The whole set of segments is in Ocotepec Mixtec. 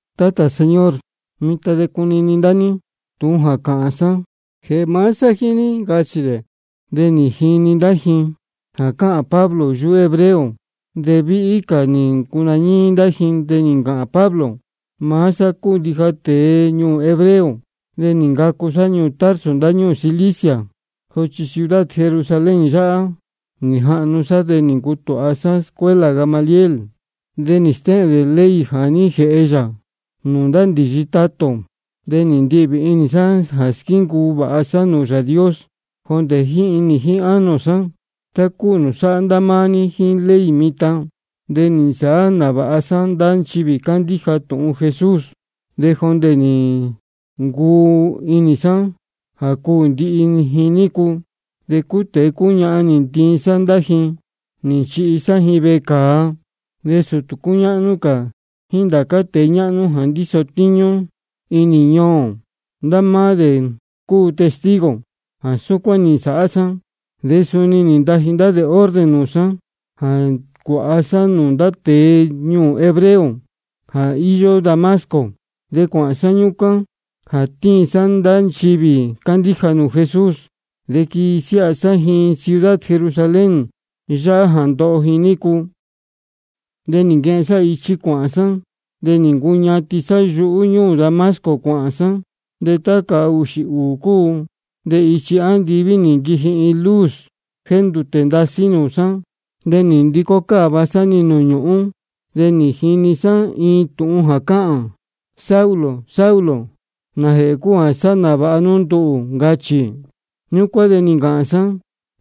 Tátā, señor, mitan de cunini ndá ní tūhun jā cāhān sá jēhē maá sá jíín ní, ncachī dē. De nī jini ndá ji jā cáhān Pablo yuhú hebreo, de víhí cā nī ncunañíí ndá ji. De nī ncāhān Pablo: Maá sá cúu ndija tēe ñuū ō hebreo, de nī ncacu sá ñuū Tarso ndáñúū Cilicia, sochi ciudad Jerusalén yáhá nī jahnu sá. De nī ncutūha sá escuela Gamaliel, de nī stéhēn dē ley jā ní jēhe yā nūū ndá ndīyi tatā ō. De nī ndihvī inī sá jā squíncuu vāha sá nūū Yāā Dios jondē jíín inī jíín ánō sá, tá cúu nūū sáhá ndá máá ní jíín ley mitan. De nī nsāhá nāvāha sá ndá nchivī cándíja tūhun Jesús, de jondē nī ncuu inī sá jā cuū ndihi ji nícu. De cúu tēe cúu ñahan nī ntiin sá ndá ji nī nchihi sá ji vecāa. De sūtū cúñáhnú cā jíín ndācá tēe ñáhnú jā ndíso tíñú inī ñuū ō, ndá máá dē cúu testigo jā súcuán nī nsāhá sá. De suni nī ntaji dē orden nūū sá jā cuāha sá nūū ndá tēe ñuū ō hebreo jā íyó Damasco. De cuāhān sá ñúcuán jā tiin sá ndá nchivī cándíja nūū Jesús de quinasiáha sá ji ciudad Jerusalén yáhá de ndoho ji nícu. De nī nquehen sá ichi cuāhān sá, de nī ncuñatin sá yuhú ñúū Damasco cuāhān sá. De tá cahūxī ūū cúu de ichi andiví nī nquiji-ni iin luz jéndūtē ndasí nūū sá. De nī ndicó cáva sá-ni nūū ñūhún, de nī jini sá iin tūhun jā cáhān: Saulo, Saulo, ¿nājēhē cúu jā sáhá nāvāha nú nduhū? ncachī. Ñúcuán de nī ncāhān sá: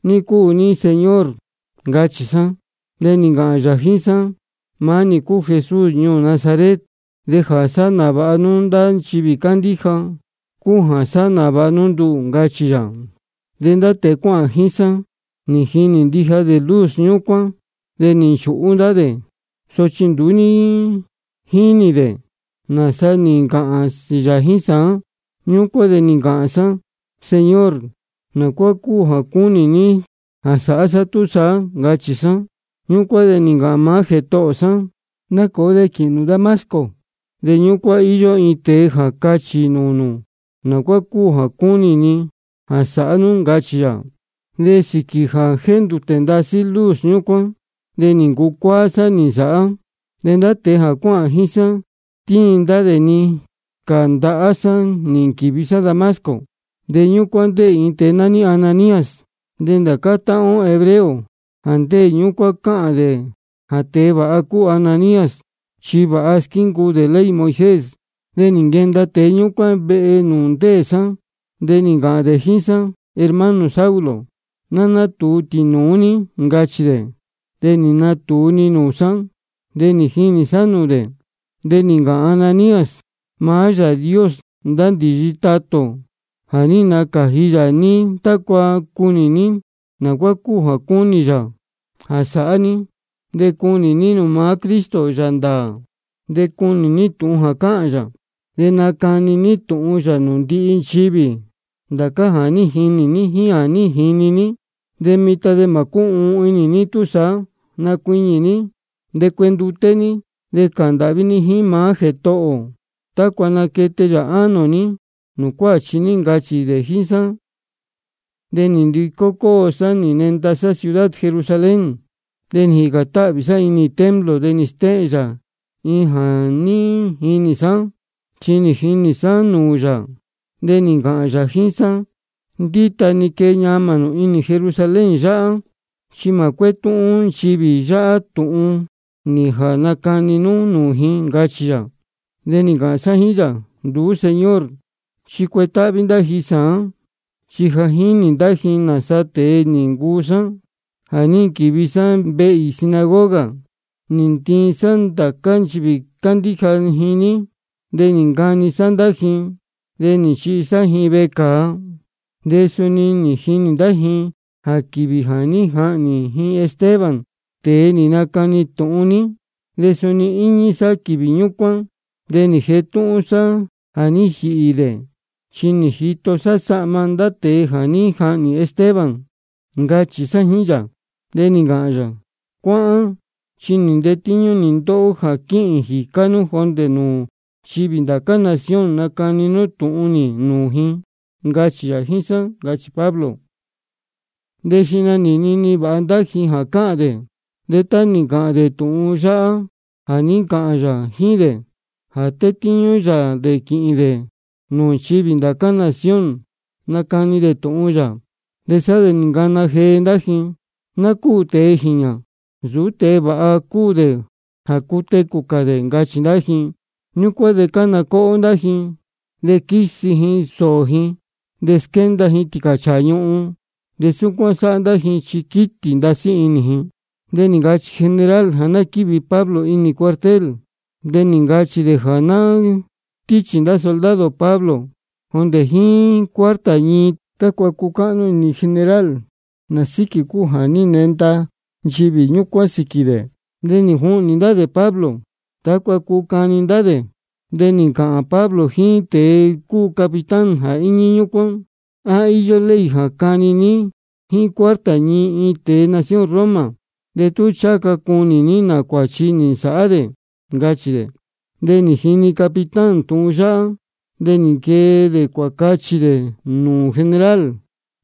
¿Ní iin cúu ní, Señor? ncachī sá. De nī ncāhān yā jíín sá: Maá nī cúu Jesús ñuū Nazaret, de jā sáhá nāvāha nú ndá nchivī cándíja cúu jā sáhá nāvāha nú nduhū, ncachī yā. De ndá tēe jā cuáhān jíín sá nī jinī ndija dē luz ñúcuán, de nī nchūhú ndá dē, sochi nduú ní jíni dē nāsa nī ncāhān yā jíín sá. Ñúcuán de nī ncāhān sá: Señor, ¿naá cúu jā cúnī ní jā sāhá sá túsaá? ncachī sá. Ñúcuán de nī ncāhān maá Jētohō sá: Nacōo, de quīhīn nū Damasco, de ñúcuán íyó iin tēe jā cachī nūū nū naá cúu jā cúnī ni jā sāhá nú, ncachī yā. De sīquī jā jéndūtē ndasí luz ñúcuán de nī ncucuáá sá-ni nī nsāhá. De ndá tēe jā cuáhān jíín sá tíin ndá dē-ni cā ndahá sá nī nquīvi sá Damasco. De ñúcuán ndéē iin tēe nání Ananías. De ndācá táhán ó hebreo jā ndéē ñúcuán cáhān jā tēe vāha cúu Ananías, chi vāha squíncuu dē ley Moisés. De nī nquenda tēe ñúcuán vehe nūū ndéē sá, de nī ncāhān dē jíín sá: Hermano Saulo, ná nátūu tīnūú ní, ncachī dē. De nī natūu-ni nūū sá, de nī jinī sá nūū dē. De nī ncāhān Ananías: Maá Yāā Dios ndá ndīyi tatā ō, ja nī nacāji yā ní tácua cunī ní naá cúu jā cúnī yā jā sāhá ní, de cunī ní nūū maá Cristo Yāā ndāā, de cuni ní tūhun jā cāhān yā. De nacani ní tūhun yā nūū ndihi nchivī ndācá jā ní jinī ní jíín jā ní jini ní. De mitan de mā cúhuun inī ní túsaá. Nacuiñī ní, de cuenduté ní, de cāhān ndāhví ní jíín maá Jētohō ō tácua naquete yā ánō ní nūū cuáchi ní, ncachī dē jíín sá. De nī ndicó cóo sá nī nenda sá ciudad Jerusalén. De jícān táhvī sá inī templo de nī stéhēn yā iin jā ní jinī sá. Chi nī jinī sá nūū yā, de nī ncāhān yā jíín sá: Ndíta-ni quee ñamā nū inī Jerusalén yáhá, chi mā cuétúhún nchivī yáhá tūhun nī jā nacani nú nūū ji, ncachī yā. De nī ncāhān sá jíín yā: Nduú, Señor, chi cuetáhví ndá ji sāán, chi ja jínī ndá ji nāsa tēe nī ncuu sá jā ní nquīvi sá ndihi vehe īī sinagoga nī ntiin sá ndācá nchivī cándíja ji ní, de nī ncani sá ndá ji, de nī nchihi sá ji vecāa. De suni jínī ndá ji jā quīvī jā ní jahnī ji Esteban, tēe nī nacani tūhun ní, de suni nī īñi sá quīvī ñúcuán, de nī jetúhún sá jā ní jīhī dē. Chi nī jito sá sahma ndá tēe jā ní jahnī Esteban, ncachī sá jíín yā. De nī ncāhān yā: Cuáhán, chi maá nī tétíñú ndóhó jā quīhīn jīcá nú jondē nūū nchivī ndá cā nación nacani nú tūhun nī nūū ji, ncachī yā jíín sá, ncachī Pablo. De xihna nī nini vāha ndá ji jā cáhān dē. De tá nī ncāhān dē tūhun yáhá jā ní ncāhān yā jíín dē jā tetíñú yā dē quīhīn dē nūū nchivī ndá cā nación nacani dē tūhun yā, sá de nī ncana jee ndá ji: Ná cúū tēe jīñā. Nsūú tēe vāha cúu dē jā cutecū cā dē, ncachī ndá ji. De súcuán cána cóhó ndá ji. De quísi ji sōō ji, de squénda ji tīcāchāā ñuhun, de súcuán sáhá ndá ji chi quítī ndasí inī ji. De nī ncachī general jā ná quívi Pablo inī cuartel. De nī ncachī dē jā ná stíchī ndá soldado Pablo jondē jíín cuarta ñii tácua cucáhnú inī general nā sīquī cúu jā ní nenda ndá nchivī ñúcuán sīquī dē. De nī juhnī ndá dē Pablo tácua cuu cani ndá dē. De nī ncāhān Pablo jíín tēe cúu capitán jā íñí ñúcuán: ¿A íyó ley jā cani ní jíín cuarta ñii iin tēe nación Roma de tú ncháha ca cunī ní nā cuāchi nī nsāhá dē? ncachī dē. De nī jini capitán tūhun yáhá, de nī nquee dē cuācachī dē nūū general: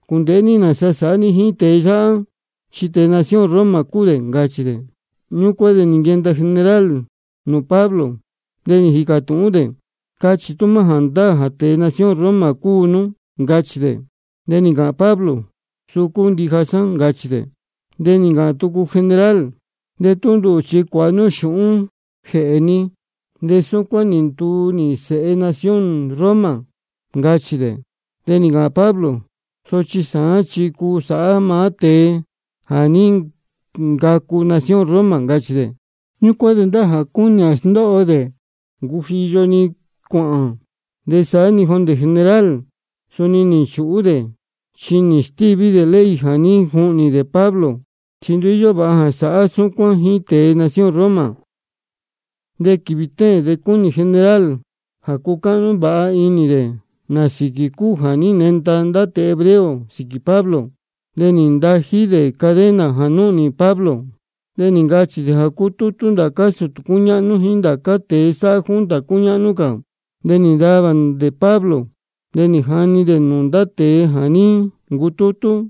Cūndēhé ní nāsa sāhá ní jíín tēe yáhá, chi tēe nación Roma cúu dē, ncachī dē. Ñúcuán de nī nquenda general nūū Pablo, de nī jīcā tūhún dē: Cachī tú maá jāndáā jā tēe nación Roma cúu nú, ncachī dē. De nī ncāhān Pablo: Suu cúu ndija sá, ncachī dē. De nī ncāhān tucu general: De nduhū chi cuāhā xūhún nī jēhe nī, de súcuán nī nduu nī sēhe nación Roma, ncachī dē. De nī ncāhān Pablo: Sochi sāán chi cúu sá maá tēe jā ní ncacu nación Roma, ncachī dē. Ñúcuán de ndá jā cúnī jā sndóho dē nī ncujiyo-ni cuāhān. De saá-ni jondē general suni nī nchūhú dē chi nī stíví dē ley jā ní juhnī dē Pablo, chi nduú íyó vāha jā sāhá súcuán jíín tēe nación Roma. De quīvī téēn de cúnī general jā cucáhnú vāha inī dē nā sīquī cúu jā ní nenda ndá tēe hebreo sīquī Pablo. De nī ndají dē cadena jā núhnī Pablo. De nī ncachī dē jā cutútú ndācá sūtū cúñáhnú jíín ndācá tēe sáhá junta cúñáhnú cā. De nī ntavā dē Pablo, de nī jani dē nūū ndá tēe jā ní ncutútú.